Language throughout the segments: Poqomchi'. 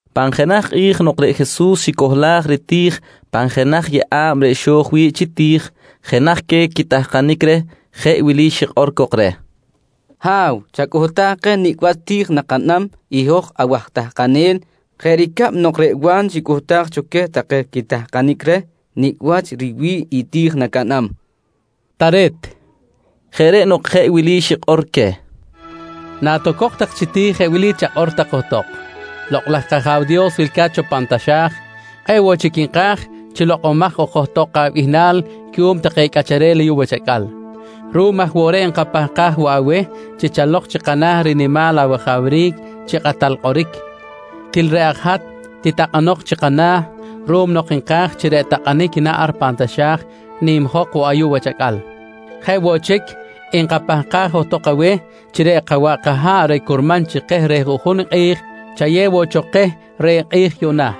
Pan jenaj kꞌi̱j nok reꞌ Jesus xicohlaj riti̱j pan jenaj yeꞌa̱b reꞌ xo̱j wi̱ꞌ chi ti̱j, jenaj queh take quitahkanic reh jeꞌ wili xikꞌor cok reh: «Ha̱w, chacꞌuhtaj keh nicꞌ wach ti̱j nakaꞌnam i hoj awaj tahkanel jeꞌ ricab nok reꞌ Wa̱n xicꞌuhtaj cho queh take quitahkanic reh nicꞌ wach riwi̱ꞌ i ti̱j nacaꞌnam, nqui cok reh. —Tare̱t, nqui Jesus. Jeꞌ reꞌ nok jeꞌ wili xikꞌor queh: «Natocok tak chi ti̱j jeꞌ wili chakꞌor tak johtok: ‹Lokꞌ laj kAja̱w Dios wilca̱t cho pan taxa̱j, kꞌe̱ꞌ woꞌ chic nka̱j chi lokꞌomaj ok johtok abihnal cuꞌum take cꞌacharel ayuꞌ wach acꞌal. Ruꞌum aj woꞌ reꞌ nkapahkaj woꞌ aweh chi chalok chi kana̱ rinimal awajawric chi kꞌatal kꞌoric. Til reꞌ aj hat titakꞌanok chi kana̱ ruꞌum nok nka̱j chi reꞌ takꞌanic naꞌn ar pan taxa̱j nimjok woꞌ ayuꞌ wach acꞌal. Jeꞌ woꞌ chic, nkapahkaj johtok aweh chi reꞌ kawaꞌ kaha̱ꞌ reꞌ curman chi keh reh juꞌjun i kꞌi̱j, chayew woꞌ cho keh reh kꞌi̱j yuꞌna.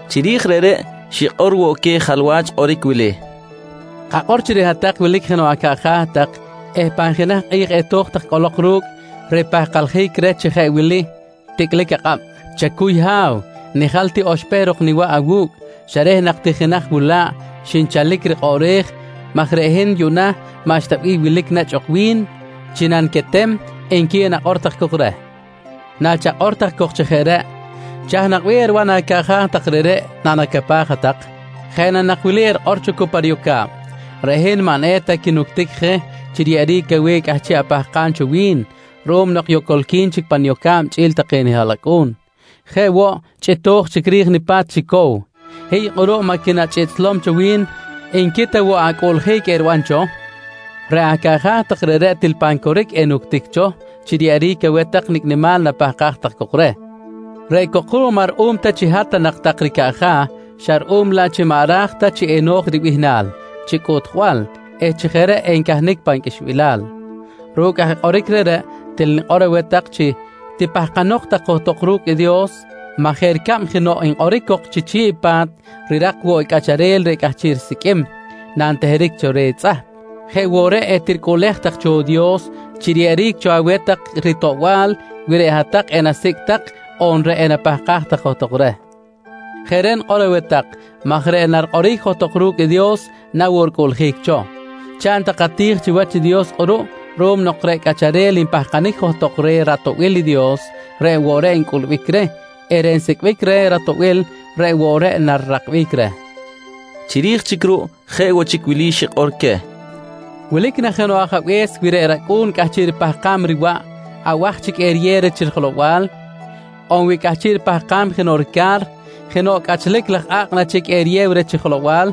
Chiri̱j reꞌreꞌ, xikꞌor woꞌ queh jalwach kꞌoric wili: «Kakꞌor chi reꞌ hat-tak wilic jenoꞌ acaꞌja̱ tak eh pan jenaj kꞌi̱j eto̱j tak cꞌolok ru̱cꞌ ripahkaljic reh chi jeꞌ wili ticꞌlic akꞌab: ‹Chacuy ha̱w, nijal ti oxpehr ok niwaꞌ awu̱cꞌ xa reh nak ti jenaj wula̱ꞌ xinchalic rikꞌoꞌrej maj reꞌ hin yuꞌna maꞌxta bih wilic nechꞌ ok wi̱n chi naniquetem, nqui enakꞌor tak cok reh. «Nachakꞌor tak cok chi jeꞌ reꞌ, chaj nak bih eriban acaꞌja̱ tak reꞌreꞌ nanacapaj hat-tak? Jeꞌ na nak wili erikꞌor cho cu pa riyoca̱b: ‹Reꞌ hin maꞌ eta quinuctic je chi riyeꞌeric aweh i cꞌahchiꞌ apahkam cho wi̱n ruꞌum nok yocolqui̱n chic pa niyoca̱b chꞌi̱l take nihaꞌlacꞌu̱n. Jeꞌ woꞌ, chꞌito̱j chic ri̱j nipa̱t chi cow. Hiy kꞌuruꞌ maꞌ quinachꞌiꞌtslom cho wi̱n, nqui ta woꞌ acꞌuꞌljic eriban cho? «Reꞌ acaꞌja̱ tak reꞌreꞌ til pan coric enuctic cho chi riyeꞌeric aweh tak nicꞌ nimal napahkaj tak cok reh, reꞌ cok ruꞌ maꞌ ruꞌum ta chi hat ta nak tak ricaꞌja̱, xa ruꞌum laꞌ chi maꞌ ra̱j ta chi eno̱j ribihnal chi cꞌuꞌtjbal eh chi jeꞌ reꞌ encahnic pan qꞌuixbilal. Ru̱cꞌ aj kꞌoric reꞌreꞌ til nikꞌor aweh tak chi tipahkanok tak johtok ru̱cꞌ i Dios maj jeꞌ ricab chi jenoꞌ nkꞌoric cok chi chi̱ꞌ i pa̱t, rirak woꞌ i cꞌacharel reꞌ cꞌahchiꞌ risiqꞌuim nanteheric cho reh i tzꞌahp, jeꞌ woꞌ reꞌ etiricꞌuꞌlej tak cho i Dios chi riyeꞌeric cho aweh tak i ritoꞌbal wi reꞌ hat-tak enasicꞌ tak on reꞌ enapahkaj tak johtok reh. Jeꞌ reꞌ nikꞌor aweh tak maj reꞌ narikꞌoric johtok ru̱cꞌ Dios na woꞌ ricꞌuꞌljic cho. Chaꞌn tak ati̱j chiwach i Dios kꞌuruꞌ ruꞌum nok reꞌ cꞌacharel npahkanic johtok reh ratoꞌbil i Dios reꞌ woꞌ reꞌ ncꞌulbic reh eh reꞌ nsicꞌbic reh ratoꞌbil reꞌ woꞌ reꞌ narirakbic reh, nqui Jesus. Chiri̱j chic ruꞌ jeꞌ woꞌ chic wili xikꞌor queh: «Wilic na jenoꞌ ajabe̱s, wi reꞌ racꞌu̱n cꞌahchiꞌ ripahkam riwaꞌ, abaj chic eriyew reh chi jelow-bal? On wi cꞌahchiꞌ ripahkam jenoꞌ rica̱r, jenoꞌ cꞌachlic laj a̱kꞌ na chic enayew tak reh chi jelow-bal?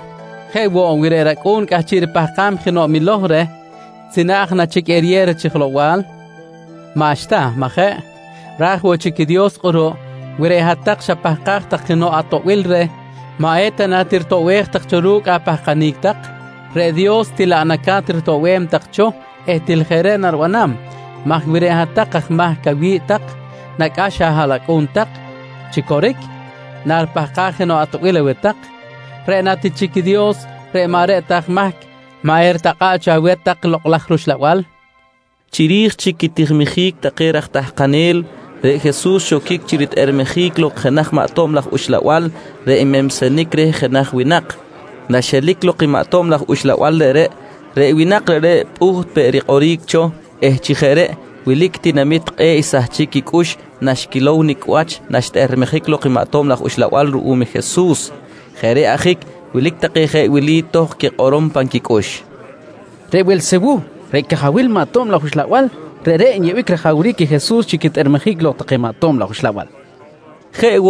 Jeꞌ woꞌ, wi reꞌ racꞌu̱n cꞌahchiꞌ ripahkam jenoꞌ miloj reh, tzinaꞌj na chic eriyew reh chi jelow-bal? Maꞌxta, majeꞌ? Ra̱j woꞌ chic i Dios kꞌuruꞌ wi reꞌ hat-tak xapahkaj tak jenoꞌ atoꞌbil reh, maꞌ eta na tiritoꞌbej tak ru̱cꞌ apahkanic tak? Reꞌ Dios til laꞌ naca̱t ritoꞌbem tak cho eh til jeꞌ reꞌ naribanam maj wi reꞌ hat-tak aj mahc awi̱ꞌ tak nacꞌax ahaꞌlacꞌu̱n tak chi coric nanquipahkaj jenoꞌ atoꞌbil aweh tak, reꞌ ta na ti chic i Dios reꞌ maꞌ reꞌ ta aj mahc, maꞌ eritakꞌa̱ꞌ cho aweh tak i Lokꞌ laj rUxlabal? nqui Jesus. Chiri̱j chic quitijiljic take raj tahkanel, reꞌ Jesus xoquic chi ritꞌermejic lok jenaj maꞌ tob laj uxlabal reꞌ nmensenic reh jenaj winak. Naxelic lok i maꞌ tob laj uxlabal reꞌreꞌ, reꞌ winak reꞌreꞌ pꞌuht peꞌ rikꞌoric cho eh chi jeꞌ reꞌ wilic tinamit kꞌe̱ꞌ xsahchic quicꞌux naxquilow nicꞌ wach naxtꞌermejic lok i maꞌ tob laj uxlabal ruꞌum i Jesus. Jeꞌ reꞌ ajic wilic take jeꞌ wili tohkꞌ quikꞌorom pan quicꞌux: «Reꞌ Welsewuh reꞌ cajawil take maꞌ tob laj uxlabal, reꞌreꞌ nyeꞌbic rajawric i Jesus chi quitꞌermejic lok take maꞌ tob laj uxlabal, nqui take.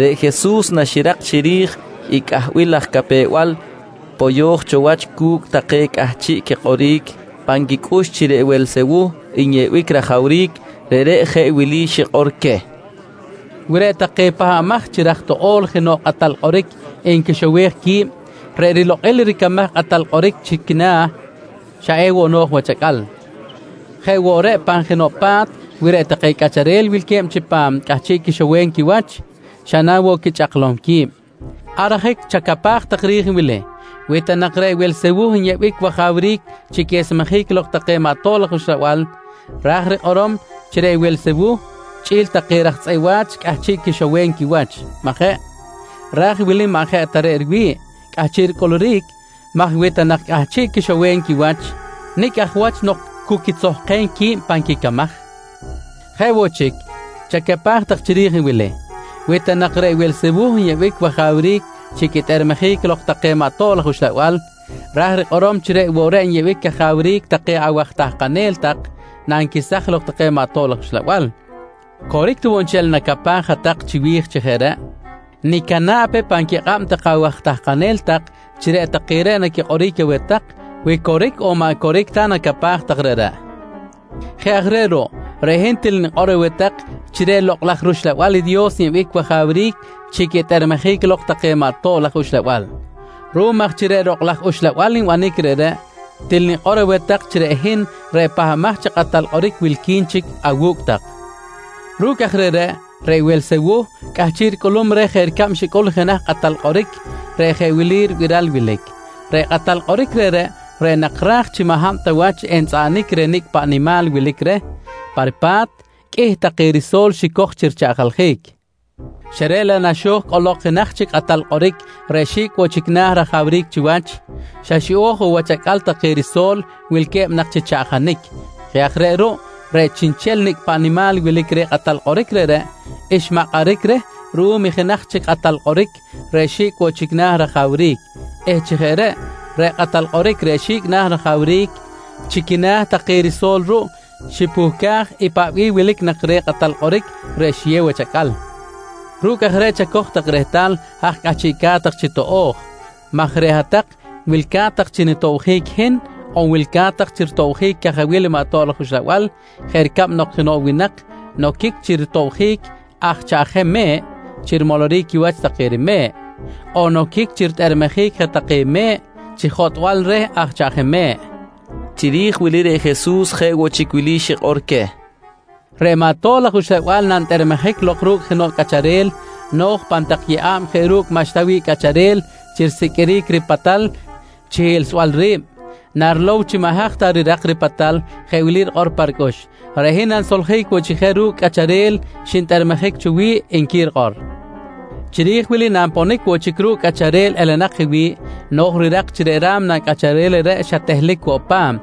Reꞌ Jesus naxirak chiri̱j i cꞌahbil laj capew-bal poyo̱j cho wach cu̱cꞌ take cꞌahchiꞌ quikꞌoric pan quicꞌux chi reꞌ Welsewuh nyeꞌbic rajawric, reꞌreꞌ jeꞌ wili xikꞌor queh: «Wi reꞌ take pahbamaj chi raj toꞌo̱l jenoꞌ kꞌatal kꞌoric nquixowej qui̱b, reꞌ rilokꞌil ricamaj i kꞌatal kꞌoric chi quina̱, xa ewoꞌ no̱j wach acꞌal. Jeꞌ woꞌ reꞌ pan jenoꞌ pa̱t, wi reꞌ take cꞌacharel wilque̱b chipam cꞌahchiꞌ quixowem quiwach, xa na woꞌ quichꞌaklom qui̱b. Ar ajic chacapaj tak ri̱j i wili: Wi ta nak reꞌ Welsewuh nyeꞌbic wajawric chi quesmejic lok take maꞌ tob laj uxlabal, ra̱j rikꞌorom chi reꞌ Welsewuh chꞌi̱l take raj tzꞌeꞌ wa̱ch cꞌahchiꞌ quixowem quiwach, majeꞌ? Raj i wili maꞌ jeꞌ ta reꞌ riwi̱ꞌ cꞌahchiꞌ ricꞌuluric maj wi ta nak cꞌahchiꞌ quixowem quiwach, nicꞌ aj wach nok cu quitzokem qui̱b pan quicamaj? Jeꞌ woꞌ chic, chacapaj tak chiri̱j i wili: Wi ta nak reꞌ Welsewuh nyeꞌbic wajawric chi quitꞌermejic lok take maꞌ tob laj uxlabal, ra̱j rikꞌorom chi reꞌ woꞌ reꞌ nyeꞌbic cajawric take awaj tahkanel tak nanquesaj lok take maꞌ tob laj uxlabal. Coric ta woꞌ nchel i nacapaj hat-tak chiwi̱j chi jeꞌ reꞌ, nicana̱ꞌ pe pan quikꞌab take awaj tahkanel tak chi reꞌ take reꞌ naquikꞌoric aweh tak, wi coric on maꞌ coric ta i nacapaj tak reꞌreꞌ. Jeꞌ aj reꞌ ruꞌ, reꞌ hin til nikꞌor aweh tak chi reꞌ Lokꞌ laj rUxlabal i Dios nyeꞌbic wajawric chi quitꞌermejic lok take maꞌ tob laj uxlabal. Ruꞌum aj chi reꞌ Lokꞌ laj Uxlabal nbanic reꞌreꞌ, til nikꞌor aweh tak chi reꞌ hin reꞌ Pahbamaj chi Kꞌatal Kꞌoric wilqui̱n chic awu̱cꞌ tak. Ru̱cꞌ aj reꞌreꞌ, reꞌ Welsewuh cꞌahchiꞌ ricꞌulum reh jeꞌ ricab xicꞌul jenaj kꞌatal kꞌoric reꞌ jeꞌ wili ribiral wilic: Reꞌ kꞌatal kꞌoric reꞌreꞌ, reꞌ nak ra̱j chi maꞌ hab ta wach entzꞌaꞌanic reh nicꞌ paꞌ nimal wilic reh pa ripa̱t, qꞌuih take riso̱l xicoj chi richaꞌjaljic xa reꞌ laꞌ naxo̱j cꞌolok i jenaj chic kꞌatal kꞌoric reꞌ xi̱cꞌ woꞌ chic na̱ rajawric chiwach, xa xiꞌo̱j woꞌ wach acꞌal take riso̱l wilque̱b nak chi chaꞌjanic. Jeꞌ aj reꞌ ruꞌ, reꞌ chiꞌnchel nicꞌ paꞌ nimal wilic reh kꞌatal kꞌoric reꞌreꞌ xmakꞌaric reh ruꞌum i jenaj chic kꞌatal kꞌoric reꞌ xi̱cꞌ woꞌ chic na̱ rajawric eh chi jeꞌ reꞌ, reꞌ kꞌatal kꞌoric reꞌ xi̱cꞌ na̱ rajawric, chi quina̱ chic take riso̱l ruꞌ xipuhcaj i paꞌ bih wilic nak reh kꞌatal kꞌoric reꞌ xiyew wach acꞌal. Ru̱cꞌ aj reꞌ chacoj tak rehtal haj cꞌahchiꞌca̱t tak chi toꞌo̱j maj reꞌ hat-tak wilca̱t tak chi nitobjic i hin on wilca̱t tak chi ritobjic i cajawil maꞌ tob laj uxlabal jeꞌ ricab nok jenoꞌ winak noquic chi ritobjic aj chaꞌjem me̱ꞌ chi rimoloric quiwach take rime̱ꞌ on noquic chi quitꞌermejic je take me̱ꞌ chi jotꞌbal reh aj chaꞌjem me̱ꞌ, nqui Jesus. Chiri̱j wili reꞌ Jesus jeꞌ woꞌ chic wili xikꞌor queh: «Reꞌ maꞌ tob laj uxlabal nantꞌermejic lok ru̱cꞌ jenoꞌ cꞌacharel, no̱j pan tak yeꞌa̱b jeꞌ ru̱cꞌ maꞌxta wi̱ꞌ cꞌacharel chi risiqꞌuiric ripatal chi hiꞌlsbal ri̱b. Narilow chi maꞌ haj ta rirak ripatal jeꞌ wili rikꞌor pa ricꞌux: ‹Reꞌ hin nanisoljic woꞌ chic je ru̱cꞌ i cꞌacharel xintꞌermejic cho wi̱ꞌ, nqui rikꞌor. «Chiri̱j wili nanponic woꞌ chic ru̱cꞌ cꞌacharel elenak je wi̱ꞌ, no̱j rirak chi reꞌ ra̱mna cꞌacharel reꞌreꞌ xa tehlic woꞌ pa̱m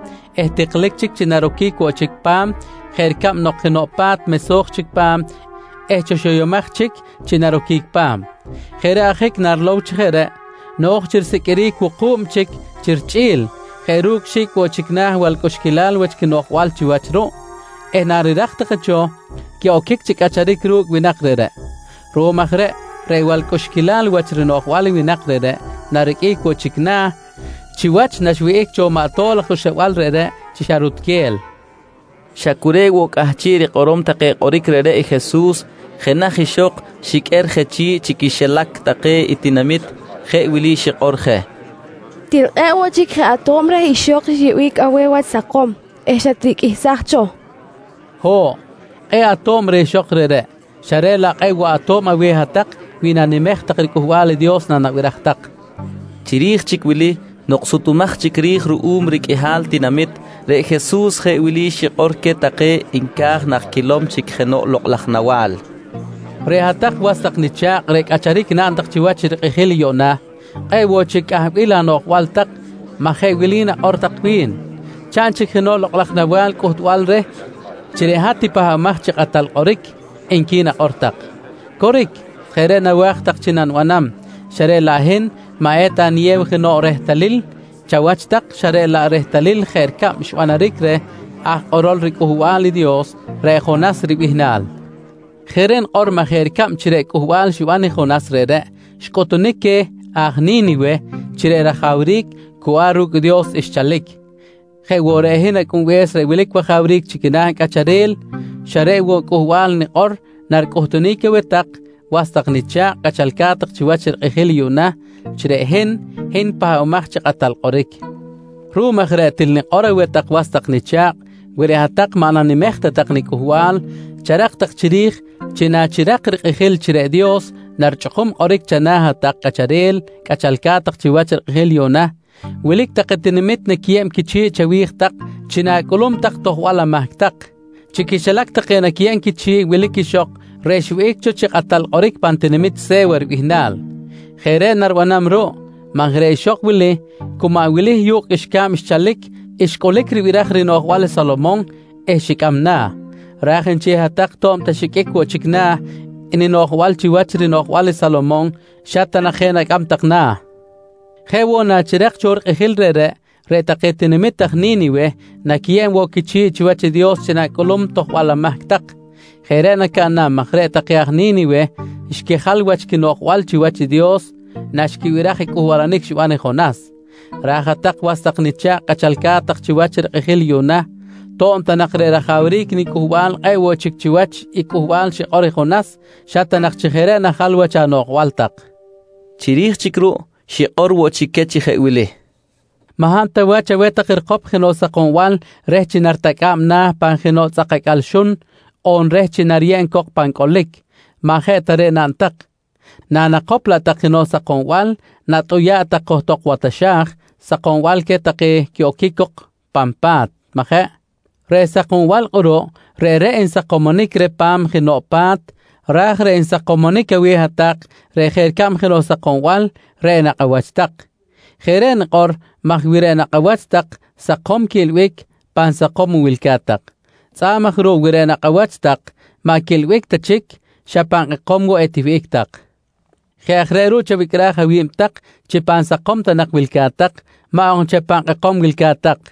eh tiklic chic chi naroquic woꞌ chic pa̱m jeꞌ ricab nok jenoꞌ pa̱t mesoj chic pa̱m eh chi xoyomaj chic chi naroquic pa̱m. Jeꞌ reꞌ ajic narilow chi jeꞌ reꞌ, no̱j chi risiqꞌuiric wuku̱b chic chi richꞌi̱l jeꞌ ru̱cꞌ xi̱cꞌ woꞌ chic na̱ balcꞌuxquilal wach quinoꞌjbal chiwach ruꞌ eh narirak take cho, quiꞌoquic chi cꞌacharic ru̱cꞌ winak reꞌreꞌ. Ruꞌum aj reꞌ, reꞌ balcꞌuxquilal wach rinoꞌjbal i winak reꞌreꞌ nariqꞌuic woꞌ chic na̱ chiwach naxwihꞌic cho maꞌ tob laj uxlabal reꞌreꞌ chi xa chi rutquel, nqui Jesus. Xa cu reꞌ woꞌ cꞌahchiꞌ rikꞌorom take kꞌoric reꞌreꞌ i Jesus, jenaj ixok xiqꞌuer je chi̱ꞌ chi quixilac take i tinamit jeꞌ wili xikꞌor je: «Til kꞌe̱ꞌ woꞌ chic je ato̱b reh ixok xyeꞌbic aweh wach sakom eh xatriqꞌuihsaj cho, nqui je reh. —Ho̱ꞌ, kꞌe̱ꞌ ato̱b reh ixok reꞌreꞌ xa reꞌ laꞌ kꞌe̱ꞌ woꞌ ato̱b aweh hat-tak wi nanimej tak i riCꞌuhbal i Dios nanabiraj tak, nqui Jesus. Chiri̱j chic wili nok sutumaj chic ri̱j ruꞌum riqꞌuihal tinamit, reꞌ Jesus je wili xikꞌor queh take nca̱j nak quilow chic jenoꞌ lokꞌ laj nawa̱l: «Reꞌ hat-tak was tak nicha̱kꞌ reꞌ cꞌacharic naꞌn tak chiwach rikꞌijil yuꞌna, kꞌe̱ꞌ woꞌ chic cꞌahbil anoꞌjbal tak maj jeꞌ wili nakꞌor tak wi̱n: ‹Chaꞌn chic jenoꞌ lokꞌ laj nawa̱l cꞌuhtbal reh chi reꞌ hat i Pahbamaj chi Kꞌatal Kꞌoric, nqui nakꞌor tak. «Coric, jeꞌ reꞌ nawa̱j tak chi nanibanam xa reꞌ laꞌ hin maꞌ eta niyew jenoꞌ rehtalil chawach tak xa reꞌ laꞌ i rehtalil jeꞌ ricab xbanaric reh i aj kꞌorol riCꞌuhbal i Dios, reꞌ Jonas ribihnal. Jeꞌ reꞌ nikꞌor maj jeꞌ ricab chi reꞌ cꞌuhbal xiban i Jonas reꞌreꞌ xcꞌuhtunic queh aj Ni̱niwe chi reꞌ rajawric cu ar ru̱cꞌ i Dios xchalic, jeꞌ woꞌ reꞌ hin Acꞌunbe̱s reꞌ wilic wajawric chi quina̱ cꞌacharel, xa reꞌ woꞌ i cꞌuhbal nikꞌor naricꞌuhtunic aweh tak was tak nicha̱kꞌ cꞌachalca̱t tak chiwach rikꞌijil yuꞌna, chi reꞌ hin, hin i Pahbamaj chi Kꞌatal Kꞌoric. Ruꞌum aj reꞌ til nikꞌor aweh tak was tak nicha̱kꞌ, wi reꞌ hat-tak maꞌ nanimej ta tak nicꞌuhbal, charak tak chiri̱j chi nachirak rikꞌijil chi reꞌ Dios narichꞌukum kꞌoric chana̱ hat-tak cꞌacharel cꞌachalca̱t tak chiwach rikꞌijil yuꞌna, wilic take tinamit naquiyeb quichi̱ꞌ chawi̱j tak chi na̱cꞌulum tak tojbal amahc tak. Chi quixilac take naquiyeb quichi̱ꞌ wilic ixok reꞌ xwihꞌic cho chi kꞌatal kꞌoric pan tinamit Se̱wa ribihnal. Jeꞌ reꞌ naribanam ruꞌ maj reꞌ ixok wili chi cu maꞌ wili yu̱kꞌ qꞌuixca̱b xchalic xcꞌulic ribiraj rinoꞌjbal i Salomon eh xicꞌam na̱, raj nchel hat-tak to̱b ta xiqꞌuic woꞌ chic na̱ ninoꞌjbal chiwach rinoꞌjbal i Salomon xa ta nak je nacꞌam tak na̱. «Jeꞌ woꞌ nachirak cho i rikꞌijil reꞌreꞌ, reꞌ take tinamit aj Ni̱niwe naquiyeb woꞌ quichi̱ꞌ chiwach Dios chi na̱cꞌulum tojbal amahc tak. Jeꞌ reꞌ nacaꞌnam maj reꞌ take aj Ni̱niwe xquijal wach quinoꞌjbal chiwach Dios naxquibiraj i cꞌuhbalanic xiban i Jonas, raj hat-tak was tak nicha̱kꞌ cꞌachalca̱t tak chiwach i rikꞌijil yuꞌna, to̱b ta nak reꞌ rajawric nicꞌuhbal kꞌe̱ꞌ woꞌ chic chiwach i cꞌuhbal xikꞌor i Jonas, xa ta nak chi jeꞌ reꞌ najal wach anoꞌjbal tak, nqui queh. Chiri̱j chic ruꞌ xikꞌor woꞌ chic queh chi jeꞌ wili: «Maꞌ hab ta wach aweh tak rikop jenoꞌ sakombal reh chi naritacꞌa̱b na̱ pan jenoꞌ tzꞌak acꞌal xun on reh chi nariyeb cok pan cꞌolic. Maꞌ jeꞌ ta reꞌ naꞌn tak, nanakop laꞌ tak jenoꞌ sakombal, natꞌuya̱ꞌ tak johtok wa taxa̱j sakombal queh take quiꞌoquic cok pan pa̱t, majeꞌ? Reꞌ sakombal kꞌuruꞌ, reꞌreꞌ nsakomonic reh pa̱m jenoꞌ pa̱t ra̱j reꞌ nsakomonic aweh hat-tak reꞌ jeꞌ ricab jenoꞌ sakombal reꞌ i nakꞌ awach tak. Jeꞌ reꞌ nikꞌor maj wi reꞌ nakꞌ awach tak sakom quiꞌilbic, pan sakom woꞌ wilca̱t tak. Tzꞌa̱b aj ruꞌ wi reꞌ nakꞌ awach tak maꞌ quiꞌilbic ta chic, xa pan kꞌekom woꞌ etiwihꞌic tak. Jeꞌ aj reꞌ ruꞌ chawicꞌraj awi̱b tak chi pan sakom ta nak wilca̱t tak, maꞌ ok nchel pan kꞌekom wilca̱t tak.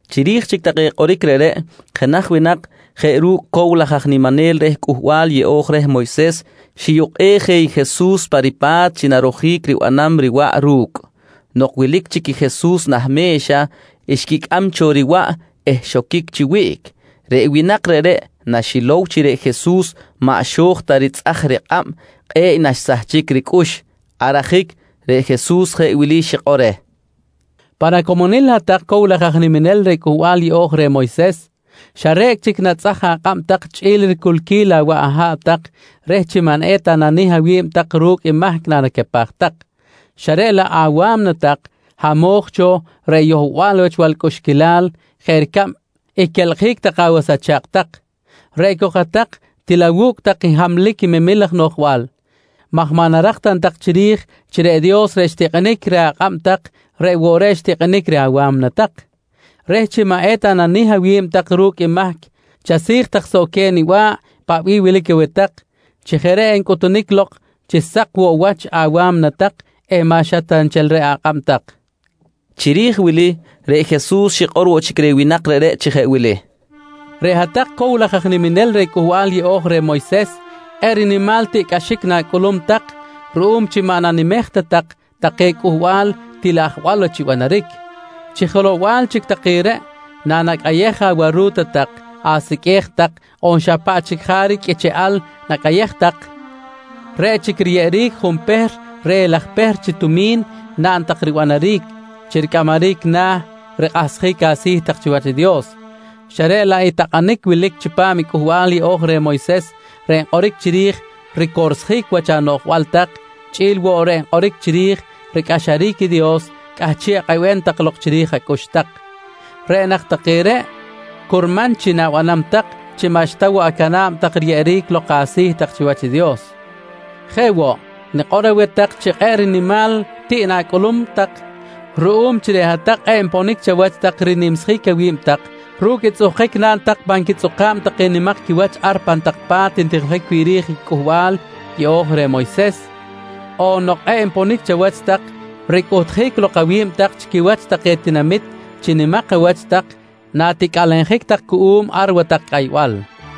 Chiri̱j chic take kꞌoric reꞌreꞌ, jenaj winak jeꞌ ru̱cꞌ cow laj aj niminel reh Cꞌuhbal Yeꞌo̱j reh Moyses xiyukꞌej je i Jesus pa ripa̱t chi narojic ribanam riwaꞌ ru̱cꞌ. Nok wilic chic i Jesus nah me̱xa, xquicꞌam cho riwaꞌ eh xoquic chi wiꞌc. Reꞌ winak reꞌreꞌ naxilow chi reꞌ Jesus maꞌ xo̱j ta ritzꞌaj rikꞌab kꞌe̱ꞌ naxsahchic ricꞌux. Ar ajic reꞌ Jesus jeꞌ wili xikꞌor reh: «Pan acomonil hat-tak cow laj aj niminel reh Cꞌuhbal Yeꞌo̱j reh Moyses, xa re̱cꞌ chic natzꞌaj akꞌab tak chꞌi̱l riculquil awaꞌ aha̱ꞌ tak reh chi maꞌ eta nanih awi̱b tak ru̱cꞌ i mahc nanacapaj tak, xa reꞌ laꞌ awa̱mna tak hamo̱j cho reh yohbal wach balcꞌuxquilal jeꞌ ricab i quelkꞌjic take awas acha̱kꞌ tak. Reꞌ cok hat-tak til awu̱cꞌ tak hamlic memil laj noꞌjbal maj maꞌ narak ta na tak chiri̱j chi reꞌ Dios reꞌ xtikꞌinic reh akꞌab tak reꞌ woꞌ reꞌ xtikꞌinic reh awa̱mna tak? Reh chi maꞌ eta nanih awi̱b tak ru̱cꞌ i mahc chasi̱j tak soꞌ queh niba̱ꞌ i paꞌ bih wilic aweh tak, chi jeꞌ reꞌ encꞌutunic lok chi sak woꞌ wach awa̱mna tak eh maꞌ xa reꞌ ta nchel akꞌab tak, nqui reh. Chiri̱j wili reꞌ Jesus xikꞌor woꞌ chic reh winak reꞌreꞌ chi jeꞌ wili: «Reꞌ hat-tak cow laj aj niminel reh Cꞌuhbal Yeꞌo̱j reh Moyses kꞌe̱ꞌ rinimal tiꞌcꞌaxic na̱cꞌulum tak ruꞌum chi maꞌ nanimej ta tak take cꞌuhbal til ajwal wach ribanaric. Chi jelow-bal laꞌ chic take reꞌ, nanacꞌayej awaru̱ta tak, asiqꞌue̱j tak on xa paꞌ chic jaric qꞌuicheꞌal nacꞌayej tak, reꞌ chic riyeꞌeric junpehr reh i laj pehr chi tumi̱n naꞌn tak ribanaric chi ricꞌamaric na̱ rikꞌahsjic asi̱ tak chiwach i Dios, xa reꞌ laꞌ i takꞌanic wilic chipam i Cꞌuhbal Yeꞌo̱j reh Moyses reꞌ nkꞌoric chiri̱j ricorsjic wach anoꞌjbal tak chꞌi̱l woꞌ reꞌ nkꞌoric chiri̱j ricꞌaxaric i Dios, cꞌahchiꞌ akꞌebem tak lok chiri̱j acꞌux tak. Reꞌ nak take reꞌ curman chi na̱nimem tak chi maꞌxta woꞌ acana̱b riyeꞌeric lok asi̱ tak chiwach i Dios. «Jeꞌ woꞌ, nikꞌor aweh tak chi kꞌe̱ꞌ rinimal tiꞌ na̱cꞌulum tak ruꞌum chi reꞌ hat-tak kꞌe̱ꞌ nponic chawach tak rinimsjic awi̱b tak ru̱cꞌ i tzꞌuhkic naꞌn tak pan quitzꞌuka̱b take nimak quiwach ar pan tak pa̱t ntijiljic wi̱ꞌ ri̱j i Cꞌuhbal yeꞌo̱j reh i Moyses on nok kꞌe̱ꞌ nponic chawach tak ricꞌuhtjic lok awi̱b tak chi quiwach take tinamit chi nimak awach tak naticꞌalenjic tak cuꞌum ar watak cꞌaybal.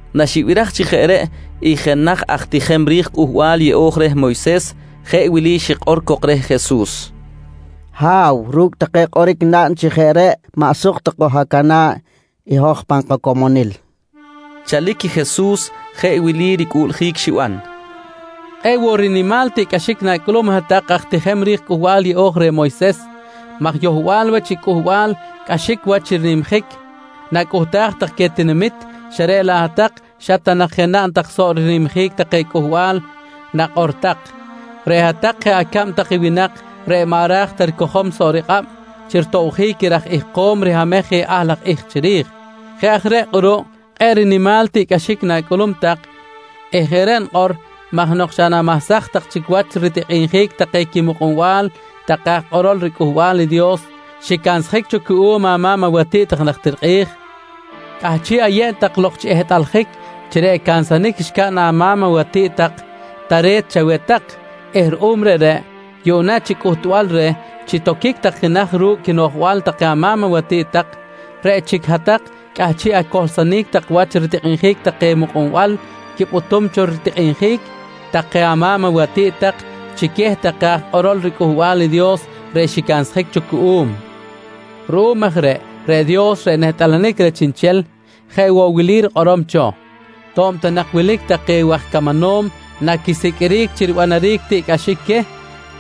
Naxibiraj chi jeꞌ reꞌ i jenaj aj tijem ri̱j Cꞌuhbal Yeꞌo̱j reh Moyses, jeꞌ wili xikꞌor cok reh Jesus: «Ha̱w, ru̱cꞌ take kꞌoric naꞌn chi jeꞌ reꞌ maꞌ suk ta koj-acana̱ꞌ i hoj pan kacomonil, nqui cok reh Jesus. Chalic Jesus jeꞌ wili ricꞌuꞌljic xiban: «Kꞌe̱ꞌ woꞌ rinimal tiꞌcꞌaxic na̱cꞌulum i hat-tak aj tijem ri̱j riCꞌuhbal Yeꞌo̱j reh Moyses maj yohbal wach i cꞌuhbal cꞌaxic wach chi nimjic nacꞌuhtaj tak queh tinamit, xa reꞌ laꞌ hat-tak xa ta nak je naꞌn tak soꞌ rinimjic take cꞌuhbal nakꞌor tak. Reꞌ hat-tak jeꞌ acab tak i winak reꞌ maꞌ ra̱j ta ricojom soꞌ rikꞌab chi ritobjic i raj ihkom rihamej je ahl laj ihk chiri̱j. Jeꞌ aj reꞌ kꞌuruꞌ kꞌe̱ꞌ rinimal tiꞌcꞌaxic na̱cꞌulum tak eh jeꞌ reꞌ nikꞌor maj nok xa namahsaj tak chic wach ritikꞌinjic take quimukꞌunbal take aj kꞌorol riCꞌuhbal i Dios xicansjic cho cuꞌum ama̱m awatiꞌt tak najtir kꞌi̱j, cꞌahchiꞌ ayeb tak lok chi ehtꞌaljic chi reꞌ cansanic xcaꞌn ama̱m awatiꞌt tak tare̱t chaweh tak eh ruꞌum reꞌreꞌ, yuꞌna chi cꞌuhtbal reh chi toquic tak jenaj ru̱cꞌ quinoꞌjbal take ama̱m awatiꞌt tak, reꞌ chic hat-tak cꞌahchiꞌ acohlsonic tak wach ritikꞌinjic take mukꞌunbal quipꞌutum cho ritikꞌinjic take ama̱m awatiꞌt tak chi queh take aj kꞌorol riCꞌuhbal i Dios reꞌ xicansjic cho cuꞌum. Ruꞌum aj reꞌ, reꞌ Dios reꞌ nehtꞌalanic reh chiꞌnchel jeꞌ woꞌ wili rikꞌorom cho: “To̱b ta nak wilic take waj camanom naquisiqꞌuiric chi ribanaric tiꞌcꞌaxic queh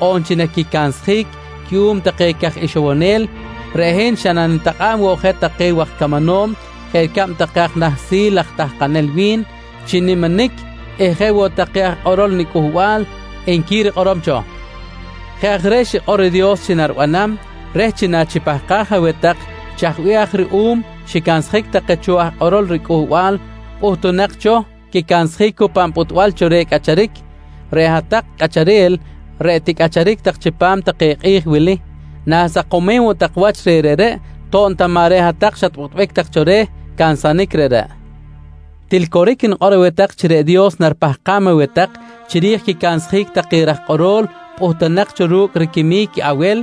on chi naquicansjic cuꞌum take caj ixowonel, reꞌ hin xa nanitakꞌa̱b woꞌ je take waj camanom jeꞌ ricab take aj nahsil aj tahkanel wi̱n chi niminic eh jeꞌ woꞌ take aj kꞌorol niCꞌuhbal, nqui rikꞌorom cho. «Jeꞌ aj reꞌ xikꞌor i Dios chi naribanam reh chi nachipahkaj aweh tak chaj bih aj ruꞌum xicansjic take cho aj kꞌorol riCꞌuhbal pꞌuhtunak cho quicansjic cu pan pꞌutbal cho reh cꞌacharic, reꞌ hat-tak cꞌacharel reꞌ ticꞌacharic chipam take kꞌi̱j wili, na̱sakomem woꞌ tak wach reh reꞌreꞌ to̱b ta maꞌ reꞌ ta hat-tak xatpꞌutbic tak cho reh cansanic reꞌreꞌ. Til coric nikꞌor aweh tak chi reꞌ Dios naripahkam aweh tak chiri̱j quicansjic take raj kꞌorol pꞌuhtunak cho ru̱cꞌ riquimic i Awel,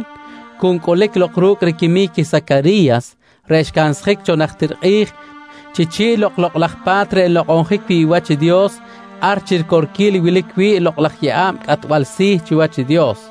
cu ncꞌulic lok ru̱cꞌ riquimic i Sacari̱yas reꞌ xcansjic cho najtir kꞌi̱j chi chi̱ꞌ lok i Lokꞌ laj Pa̱t reꞌ nlokꞌonjic wi̱ꞌ wach i Dios ar chi ricorquil i wilic wi̱ꞌ i lokꞌ laj yeꞌa̱b cꞌatbal si̱ chiwach i Dios.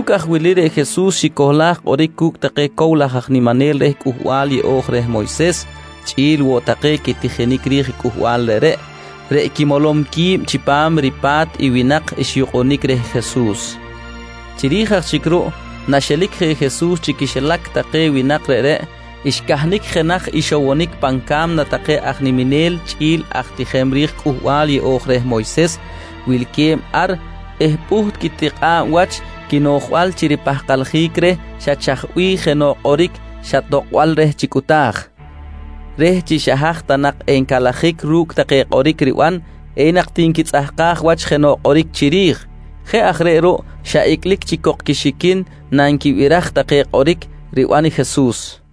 Ru̱cꞌ aj wili reꞌ Jesus xicohlaj kꞌoric cu̱cꞌ take cow laj aj niminel reh Cꞌuhbal yeꞌo̱j reh Moyses chꞌi̱l woꞌ take quitijinic ri̱j cꞌuhbal reꞌreꞌ, reꞌ quimolom qui̱b chipam ripa̱t i winak xyukꞌunic reh Jesus. Chiri̱j aj chic ruꞌ, naxelic je Jesus chi quixilac take winak reꞌreꞌ, xcahnic jenaj ixowonic pan ca̱mna take aj niminel chꞌi̱l aj tijinel ri̱j i Cꞌuhbal Yeꞌo̱j reh Moyses wilque̱b ar eh pꞌuht quitikꞌa̱b wach quinoꞌjbal chi ripahkaljic reh xa chaj bih jenoꞌ kꞌoric xa tokꞌbal reh chi cꞌuta̱j reh chi xa haj ta nak encalajic ru̱cꞌ take kꞌoric riban enak ti nquitzꞌahkaj wach jenoꞌ kꞌoric chiri̱j. Jeꞌ aj reꞌ ruꞌ xa icꞌlic chic cok quixiquin nanquibiraj take kꞌoric riban i Jesus.